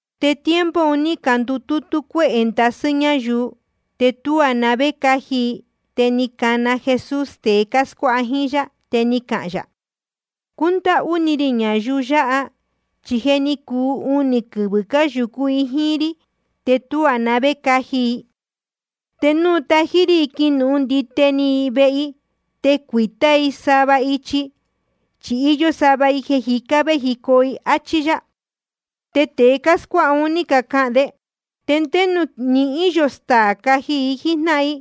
Te tiempo un ní candutútú cuéhē ndasɨ́ ñáyuu, te tuá na vé caji i. Te ni cana Jesús tēe cáscuáha jíín yá, te ni cahān yā: Cúndáhú ni rī ñayuu yāhá, chi je ni cuu unī quɨvɨ̄ cáyūcú i jíín rí, te tuá na vé caji i. Te núu natají rí i quinuhun ndite i vehe i, te cuīta íī i sava ichi, chi íyó sava i jeē jicá véjicoo i, áchí yá. Te tēe cáscuáha un ní cacahān de: ¿Te ndé nuū nihín yō staā caji i jíjnáhan i?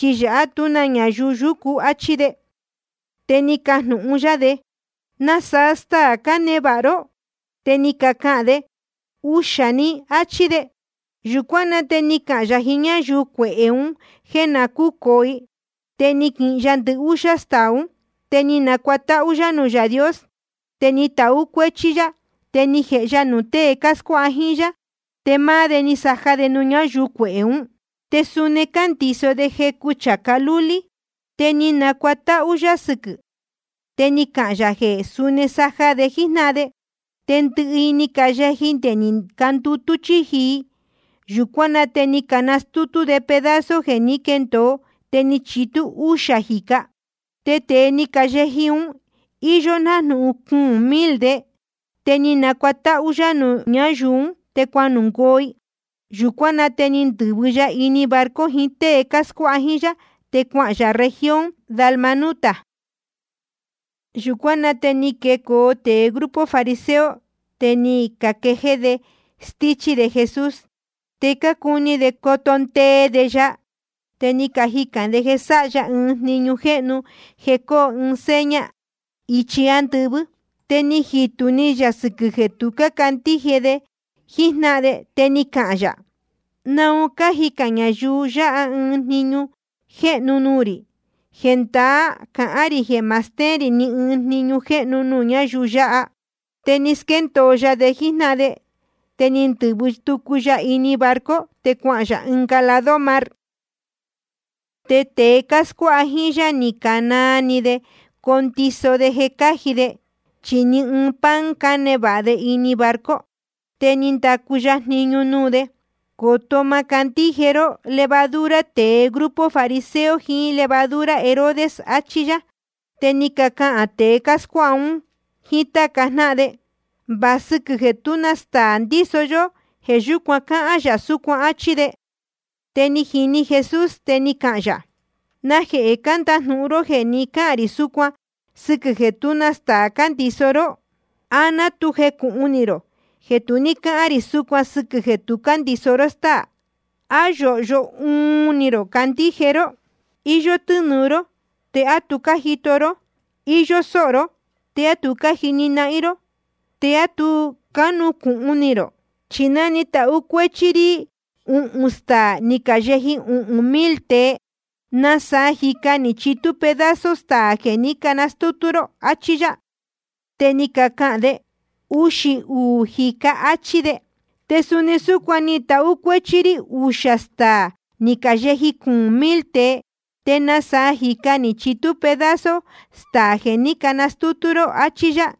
Chi yāhá tú na ñayuu yúcu, áchí de. Te ni cajnūhun yá de: ¿Nasaa staā cánevāha ró? Te ni cacahān de: Uxā‑ni, áchí de. Yūcuán na te ni cahān yā jiín ñáyuu cuehē un jéē na cúcōo i. Te ni quihin ya ndɨhúxá staā ún, te ni nacuatáhú yá nuū Yaā Dios. Te ni tahú cuéchí yá, te ni jēhe ya nuū tée cáscuáha jíín yá. Te máá de ni casaja de nuū ñáyuu cuehē ún. Te suni cándiso de jecu chācá lúlí. Te ni nacuatáhú yá sɨquɨ̄, te ni cahān yā jeē suni saja de jíjnáhan de. Te ndɨhɨ i ni cayeji, te ni candutú chíji i. Yūcuán na te ni canastútú de pedazo jeē ní quendōo, te ni chitú úxā jīca. Te tēe ni cayeji un, íyó nájnūhun cuūn mil de. Te ni nacuatáhú yá nuū ñáyuu ún, te cuanungoo i. Yūcuán na te ni ndɨ̄vɨ‑ni ya ini barco jiín tée cáscuáha jíín yá, te cuahān yā región Dalmanuta. Yūcuán na te ni quecoo tēe grupo fariseo, te ni caquejéé de stíchí de Jesús. Te cácuni de coto ndee de ya, te ni cajicān de jeē sáha ya ɨɨn jniñu jéhnu jeē coo ɨɨn seña ichi ándɨvɨ́. Te ni jitū ni yā sɨquɨ̄ jeē tu cácandíje de jíjnáhan de, te ni cahān yā: ¿Naun cájicān ñayuu yáha ɨɨn jniñu jéhnu nuū rī? Jendaá cahán rī jeē ma stéén rī ni ɨɨn jniñu jéhnu nuū ñáyuu yāhá. Te ni squéndōo ya de jíjnáhan de, te ni ndɨ̄vɨ tucu ya ini barco, te cuahān yā ɨnga lado mar. Te tēe cáscuáha jíín yá ni canaa ni de condiso de jeē cáji de, chi ɨɨn‑ni pan cánevāha de ini barco. Te ni ndacu ya jniñu nuū de: Coto má candíje ró levadura tēe grupo fariseo jiín levadura Herodes, achí yá. Te ni cacahān tēe cáscuáha un jíín táca jnáhan de: Va sɨquɨ̄ jeē tú na staā ndíso yó, jeē yúcuan cáhán yā súcuan, áchí de. Te ni jini Jesús, te ni cahān yā: ¿Najehē cándajnūhun ró jeē ni cáhān rī súcuan sɨquɨ̄ jeē tú na staā cándiso ró? ¿A ná tu cuni rō, á ná tu jecūhun ni rō jeē tu ní cáhān rī súcuan sɨquɨ̄ jeē tu cándiso ró stáā? ¿A yóhyo uun ni rō candíje ró? Iyó tɨ́nūu ró ¿te á tu cájito ró? Iyó sóho ró ¿te á tu cájini ró? ¿Te á tu cánucūhun ni rō? Chi ná ni tahú cuéchí rí uhūn staā ni cayeji uhūn mil tēe, ¿te nasaa jīca ni chitú pedazo staā jeē ní canastútú ró? Achí yá. Te ni cacahān de: Uxī uū jīca, áchí de. Te suni súcuan ná ni tahú cuéchí rí uxā staā ni cayeji cuūn mil tēe, ¿te nasaa jīca ni chitú pedazo staā jeē ní canastútú ró? Achí yá.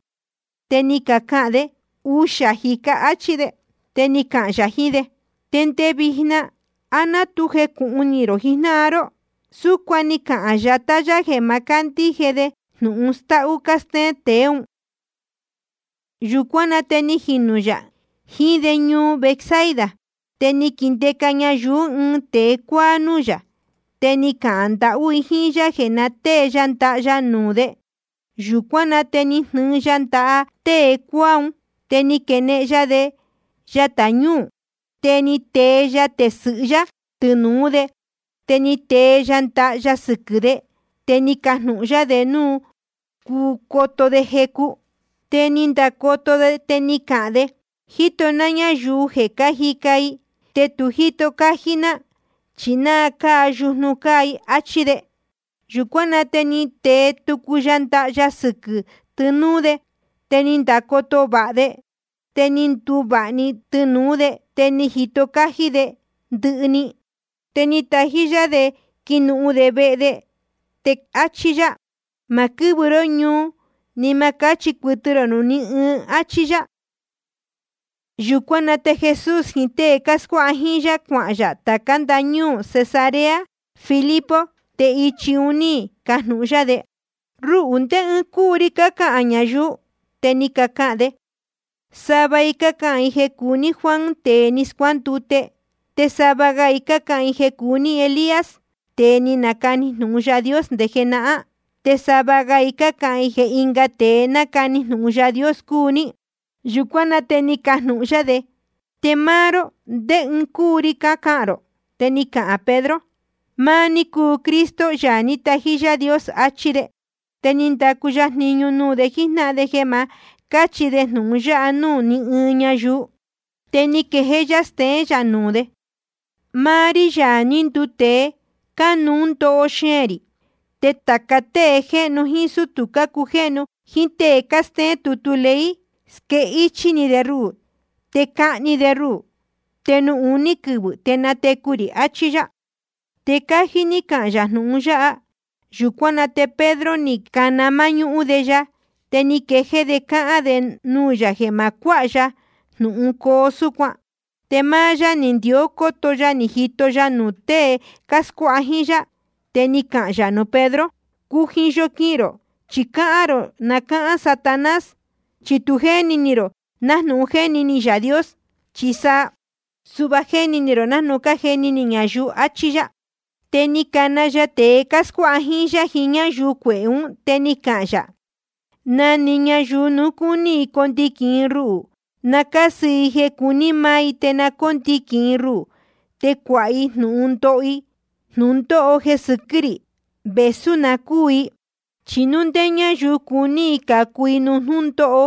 Te ni cacahān de: Uxā jīca, áchí de. Te ni cahān yā jiín de: Te nde vijna ¿á ná tu jecūhun ni rō jijnáhan ró? Súcuan ni cahān yatá yá jeē ma cándíje de jnūhun stáhú cástéén tēe ún. Yūcuán na te ni jinū yā jiín de ñuu Betsaida. Te ni caquindeca ñayuu ɨɨn tēe cuáá núū yā, te ni cacahān ndahú i jíín yá jeē na tée ya ndaha ya nuū de. Yūcuán na te ni jnɨɨ ya ndaha tēe cuáá un, te ni quenehen ya de yatā ñúū ún. Te ni tee ya tesɨ̄hɨ yá tɨnūú de, te ni tee ya ndaha ya sɨquɨ̄. Te ni cajnūhun yá de núu cuu coto de jecu. Te ni ndacoto de, te ni cahān de: Jíto ná ñayuu jeē cájica i, te tu jíto cájí ná, chi ná cáa yujnu cáa i, áchí de. Yūcuán na te ni tee tucu ya ndaha ya sɨquɨ̄ tɨnūú de. Te ni ndacoto vāha de, te ni nduvāha‑ni tɨnūú de, te ni jito cájí de ndɨhɨ‑ni. Te ni natají yá de quinuhun de vehe de, te áchí yá: Ma quɨ́vɨ ró ñuu, ni ma cáchi cuɨtɨ rō nuū ní ɨɨn, áchí yá. Yūcuán na te Jesús jiín tée cáscuáha jíín yá, cuahān yā tācá ndañúū Cesarea Filipo. Te ichi un ní cajnūhun yá de: Ruhū, ¿ndé ɨɨn cúu ri cácahān ñayuu? Te ni cacahān de: Sava i cácahān jeē cúu ní Juan tēe ni scuándute. Te sava ga i cácahān jeē cúu ní Elías, tēe ni nacani jnūhun Yaā Dios nde jenahán. Te sava ga i cácahān jeē ɨnga tēe ni nacani jnūhun Yaā Dios cúu ní. Yūcuán na te ni cajnūhun yá de: Te máá ró, ¿ndé ɨɨn cúu ri cácahān rō? Te ni cahān Pedro: Máá ní cúu Cristo, Yaā ní tají Yaā Dios, achí de. Te ni ndacu ya jniñu nuū de jíjnáhan de jeē ma cáchi de jnūhun yáha nuū ní ɨɨn ñayuu. Te ni quejéé yá steén yā nuū de: Máá rí, Yaā ní nduu tēe, cánuú ndoho xeēn rī. Te tāca tée jéhnu jíín sútū cácujéhnu jíín tée cástéén tutu ley, squéhichī de ruhū, te cahni de ruhū. Te nuū uní quɨvɨ̄ te natecu rī, achí yá. Te cájí ní cahān yā jnūhun yáha. Yūcuán na te Pedro, ni cana máñúhún de ya, te ni quejéé de cáhán de nuū yā jeē ma cuáha ya jnūhun coo súcuan. Te máá yá ni ndió cóto ya ni jito ya nuū tée cáscuáha jíín yá. Te ni cahān yā nuū Pedro: Cujiyo quihīn rō, chi cáhán rō ná cáhán Satanás. Chi tu jéni ni rō nájnūhun jéni ni Yaā Dios, chi sa suhva jéni ni rō nájnūhun cájeni ni ñayuu, achí yá. Te ni cana ya tēe cáscuáha jíín yá jiín ñáyuu cuehē ún, te ni cahān yā: Na‑ni ñayuu núu cúní i condiquīn i ruhū, na cásɨ i jeē cuní maá i, te na cóndiquīn i ruhū te cuāha i jnūhun ndoho i jnūndóho jeē sɨquɨ́ rī, vēsú na cúū i. Chi núu ndé ñáyuu cuní i cācu i nuū jnúndóho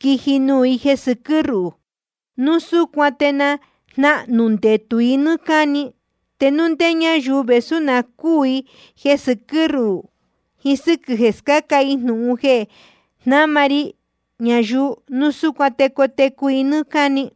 quiji nuū i jeē sɨquɨ́ ruhū, núu súcuan te jnahnū ndetū i nɨ́ɨ́ cáni. Te núu ndé ñáyuu, vēsú na cúū i jeē sɨquɨ́ ruhū jiín sɨ́quɨ̄ jeē scáca i jnūhun jeē jnáma ri ñayuu, núu súcuan te cotecu i nɨ́ɨ́ cáni.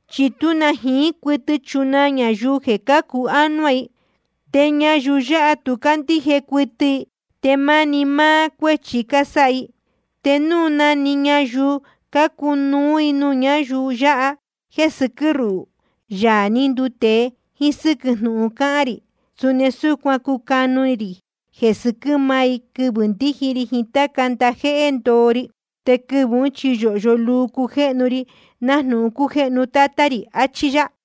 Chi tú na jiín cuɨtɨ chunaa ñayuu jeē cácu ánuá i. Te ñayuu yáha tu cácandíje cuɨtɨ i, te máni máá cuéchi cásáha i. Te núu na‑ni ñayuu cúcanu i nuū ñáyuu yáha jeē sɨquɨ́ ruhū, Yaā ní nduu tēe, jíín sɨ́quɨ̄ jnúhun cáhán rī, suni súcuan cucanu rī jeē sɨquɨ́ máá i, quɨvɨ̄ ndíji ri jiín táca ndajéhé ndoo ri. Te quɨvɨ̄ ún chi yōhyo luu cujéhnu ri nájnūhun cújéhnu Tátá rī. Achí yá.